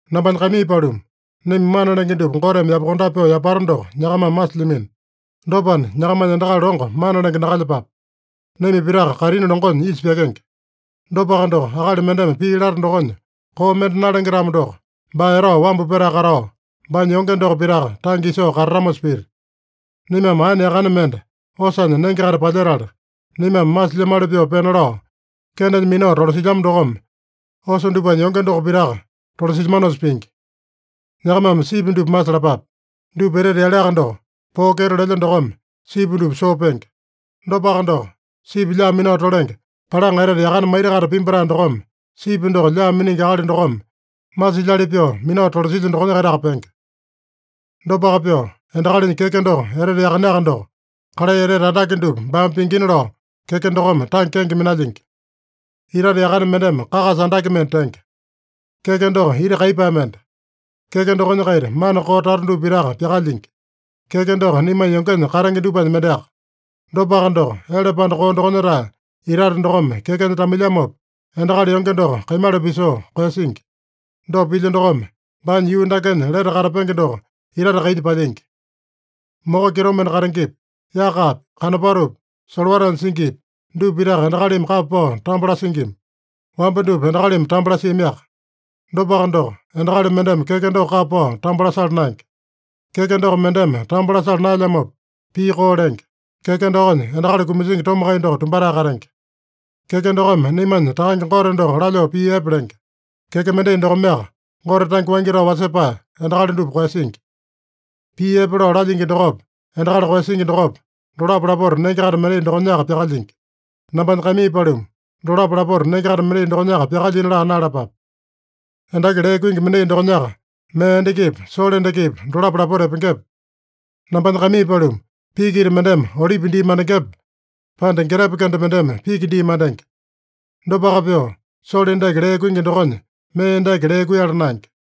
Nambanya kaimii paluma, naima mana lenge dupa Goteme yapakondape pyoo yapata doko nyakamame masilyamino. Dopana, nyakamanya endakali longo mana lenge nakalyepape. Naima pitaka kaitini longonya isa pyakenge. Dopaka doko, akali mendeme pii lata dokonya koo mende nalenge-tamo doko, baa etao wambu petae katao, baanya yonge doko pitaka tange isoo katatamosa pita. Naimame aene yakane mende osanya nenge-kaita palyetala, naimame masilyamali pyoo pena lao kendenya minao tolasilyama dokome osa dupanya yonge doko pitaka tolasilyamanosa pingi. Nyakamame sipi dupa masalapape. Dupa etete yaleaka doko, poo kyeto lelya dokome sipi dupa soo penge. Dopaka doko, sipi lyaa minao tolenge palaŋa etete yakane maita-kaita pimbatae dokome, sipi doko lyaa miningi akali dokome masilyali pyoo minao tolasilya dokonya-kaitaka penge. Dopaka pyoo, endakalinya keke doko etete yakaneaka doko, kalai etete andake dupa baame pingina lao keke dokome tange kenge minalyingi. Itate yakane mendeme kakasa andake mende tenge. Keke doko ita kaiyepae mende. Keke dokonya-kaita mana koo tata dupa pitaka pyakalyingi. Keke doko naimanya yongenya katenge dupanya mendeaka. Dopaka doko, ele panda koo dokonya-tae itate dokome kekenya tamailyamopa, endakali yonge doko kaimala pisoo koeyasingi. Dopa pilya dokome, baanya yuu dakenya lete katapenge doko, itate kainya palyingi. Moko kitomende katengepi, yakapi, kanopatopi, solowatanya singipi, dupa pitaka endakalimi kapa pao tambo lasingima. Wamba dupa endakalimi tambo lasiamiaka. Dopaka doko, endakali mendeme keke doko kapa pao tambo lasala naenge. Keke doko mendeme tambo lasala naelyamopa, pii koo lenge. Keke dokonya endakali kumasingi tomakai doko tumbatae katenge. Keke dokome naimanya Takange Gote doko lalyoo pii epe lenge. Keke mendai dokomeaka Gote tange waingi tao wasepae endakali dupa koeyasingi. Pii epe lao lalyingi dokopa, endakali koeyasingi dokopa, dolapo lapota nenge-kaita mendai dokonyaka pyakalyingi. Nambanya kaimii paluma, dolapo lapota nenge-kaita mendai dokonyaka pyakalyina laa naeyalapape. Endaki lee kuingi mendai dokonyaka mee endakipa, sole endakipa, dolapo lapota epengepe? Nambanya kaimii paluma, piki ita mendeme olipi dii mandengepe, pande getepe kende mendeme piki dii mandenge? Dopaka pyoo, sole endaki lee kuingi dokonya mee endaki lee kuiyala naenge.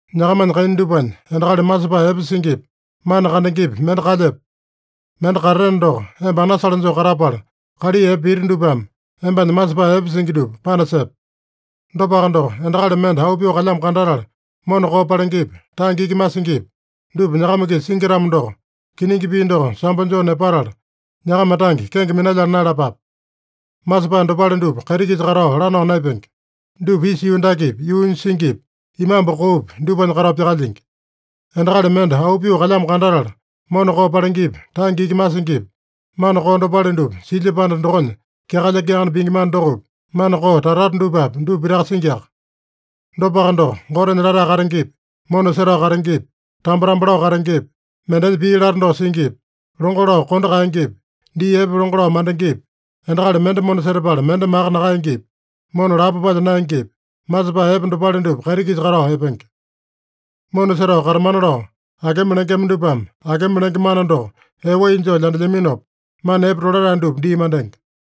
Nyakamanya kaina dupanya endakali masepae epe singipi, mana kandengepi mende kalyepe? Mende katateno doko, emba anasale joo katapala, kalai epe piti dupame embanya masepae epe singi dupa panasepe. Dopaka doko, endakali mende auu pyoo kalyamo kandatala mona koo palengepi, tange iki masingipi, dupa nyakama-kisa singi-tamo doko, kiningi pii doko sambo joo nepatala, nyakama tange kenge minalyala naeyalapape. Masepae dopale dupa kaiti-kisa katao lanao naepenge. Dupa isa yuu dakepi, yuunya singipi, imambu koopi, dupanya katao pyakalyingi. Endakali mende auu pyoo kalyamo kandatala mona koo palengepi, tange iki masingipi, mana koo dopale dupa silya panda dokonya kyakalya-kyakane pingi mana dokopi, mana koo tata-tata dupapi, dupa pitaka singiaka. Dopaka doko, Gotenya latae katengepi, mona setao katengepi, tambo-tambo lao katengepi, mendenya pii lata doko singipi, longo lao kondo kaengepi, dii epe longo lao mandengepi, endakali mende mona setapala mende maka nakaengepi, mona lapo palya naengepi, masepae epe dopale dupa kaiti-kisa katao epenge. Mona setao katamana lao akema lengema dupame akema lenge mana doko ee wai joo lyandelyaminopa, mana epe tolatae dupa dii mandenge.